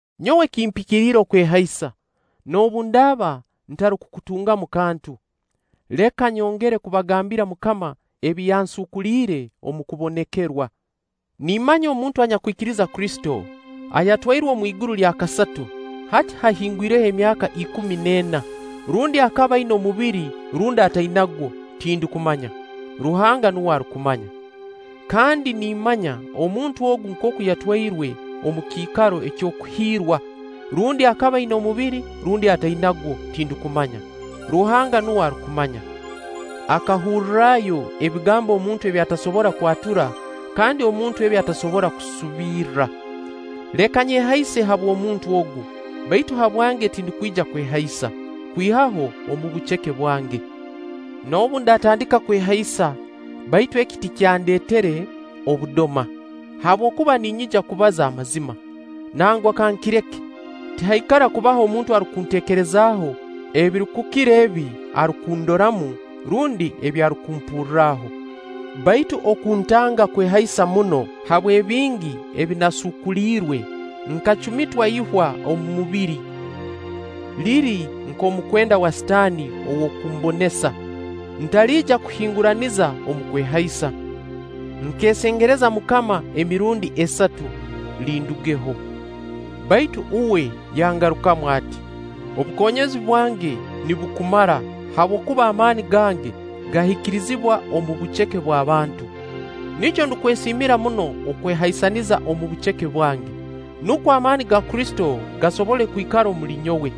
Nyowe kimpikiriire okwehaisa, noobu ndaaba ntarukukutungamu kantu. Leka nyongere kubagambira MUKAMA ebi yansuukuliire omu kubonekerwa. Nimmanya omuntu anyakwikiriza Kristo, ayatwairwe omu iguru lya kasatu, hati haahingwireho emyaka ikumi n'ena-rundi akaba aina omubiri rundi atainagwo, tindukumanya. Ruhanga nuwe arukumanya. Kandi nimmanya omuntu ogu nkooku yatwairwe omu Kiikaro ky'Okuhiirwa-rundi akaba aina omubiri rundi atainagwo, tindukumanya. Ruhanga nuwe arukumanya. Akahurrayo ebigambo omuntu ebi atasobora kwatura kandi omuntu ebi atasobora kusubirra. Leka nyehaise habw'omuntu ogu, baitu habwange tindukwija kwehaisa, kwihaho omu buceke bwange. Noobu ndatandika kwehaisa, baitu eki tikyanteere obudoma, habwokuba ninyija kubaza amazima. Nangwa kankireke, tihaikara kubaho omuntu arukunteekerezaho ebirukukira ebi arukundoramu, rundi ebi arukumpurraho. Baitu okuntanga kwehaisa muno habw'ebingi ebi naasuukuliirwe, nkacumitwa ihwa omu mubiri, liri nk'omukwenda wa Sitaani ow'okumbonesa, ntaliija kuhinguraniza omu kwehaisa. Nkeesengereza MUKAMA emirundi esatu, lindugeho; baitu uwe yangarukamu ati: “Obukonyezi bwange nibukumara, habwokuba amaani gange gahikirizibwa omu buceke bw'abantu.” Nikyo ndukwesiimira muno okwehaisaniza omu buceke bwange, nukwo amaani ga Kristo gasobole kwikara omuli nyowe.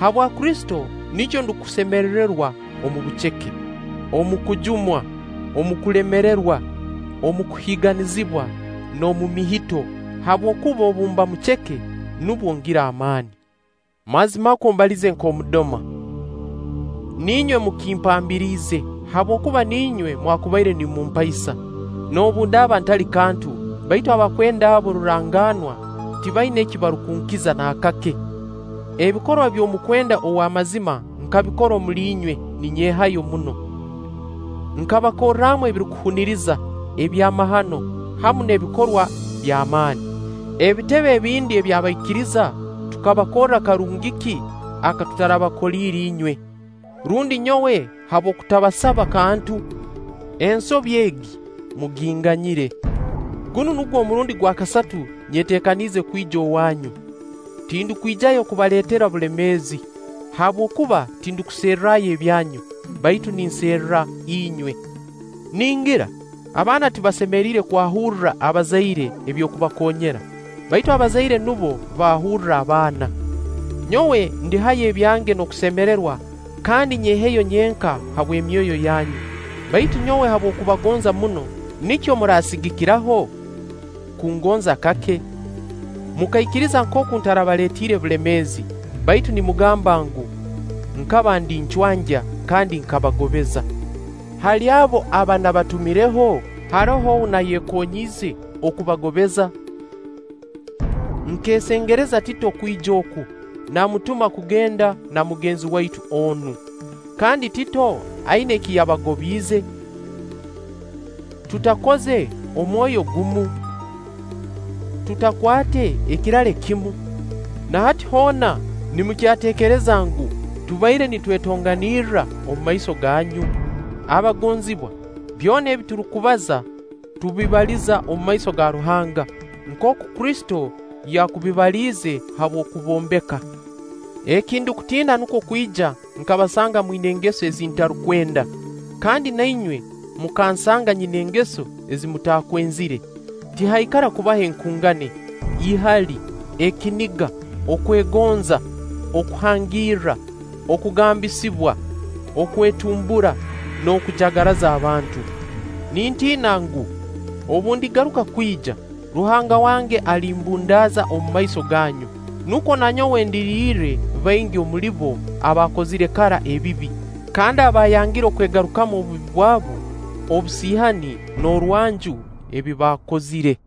Habwa Kristo, nikyo ndukusemererwa omu buceke, omu kujumwa, omu kulemererwa, omu kuhiiganizibwa, n'omu mihito; habwokuba obu mba muceke, nubwo ngira amaani. Mazimakwo mbalize nk'omudoma! Niinywe mukimpambiriize, habwokuba niinywe mwakubaire nimumpaisa. Noobu ndaaba ntali kantu, baitu abakwenda abo rurangaanwa tibaina eki barukunkiza naakake. Ebikorwa by'omukwenda ow'amazima nkabikorra omuli inywe ninyehayo muno. Nkabakorramu ebirukuhuniriza, ebyamahano, hamu n'ebikorwa by'amaani. Ebitebe ebindi by'abaikiriza tukabakorra karungi ki aka tutarabakoliire inywe? Rundi nyowe habw'okutabasaba kantu? Ensobi egi muginganyire! Gunu nugwo omurundi gwa kasatu nyeteekaniize kwija owaanyu. Tindukwijayo kubaleetera obulemeezi, habwokuba tindukuserrayo ebyanyu, baitu ninserra inywe. Ningira abaana tibasemeriire kwahurra abazaire eby'okubakoonyera, baitu abazaire nubo baahurra abaana. Nyowe ndihayo ebyange n'okusemererwa kandi nyeheyo nyenka habw'emyoyo yanyu. Baitu nyowe habw'okubagonza muno, nikyo murasigikiraho kungonza kake? Mukaikiriza nkooku ntarabaleetiire bulemeezi, baitu nimugamba ngu, nkaba ndi ncwangya kandi nkabagobeza. Hali abo aba nabatumireho, haroho ou nayekonyiize okubagobeza? Nkeesengereza Tito kwija oku, namutuma kugenda na mugenzi waitu onu. Kandi Tito aina eki yabagobiize? Tutakoze omwoyo gumu? Tutakwate ekirale kimu? Na hati hoona nimukyateekereza ngu, tubaire nitwetonganirra omu maiso ganyu? Abagonzibwa, byona ebi turukubaza tubibaliza omu maiso ga Ruhanga, nkooku Kristo yakubibaliize habw'okubombeka. Eki ndukutiina nukwo kwija nkabasanga mwina engeso ezi ntarukwenda, kandi na inywe mukansanga nyina engeso ezi mutaakwenzire; tihaikara kubayo enkungani, ihali, ekiniga, okwegonza, okuhangiira, okugambisibwa, okwetumbura, n'okujagaraza abantu. Nintiina ngu, obu ndigaruka kwija, Ruhanga wange alimbundaaza omu maiso gaanyu, nukwo na nyowe ndirirre baingi omuli abo abaakozire kara ebibi, kandi abaayangire okwegarukamu obubi bwabu, obusiihani, n'orwanju ebi baakozire.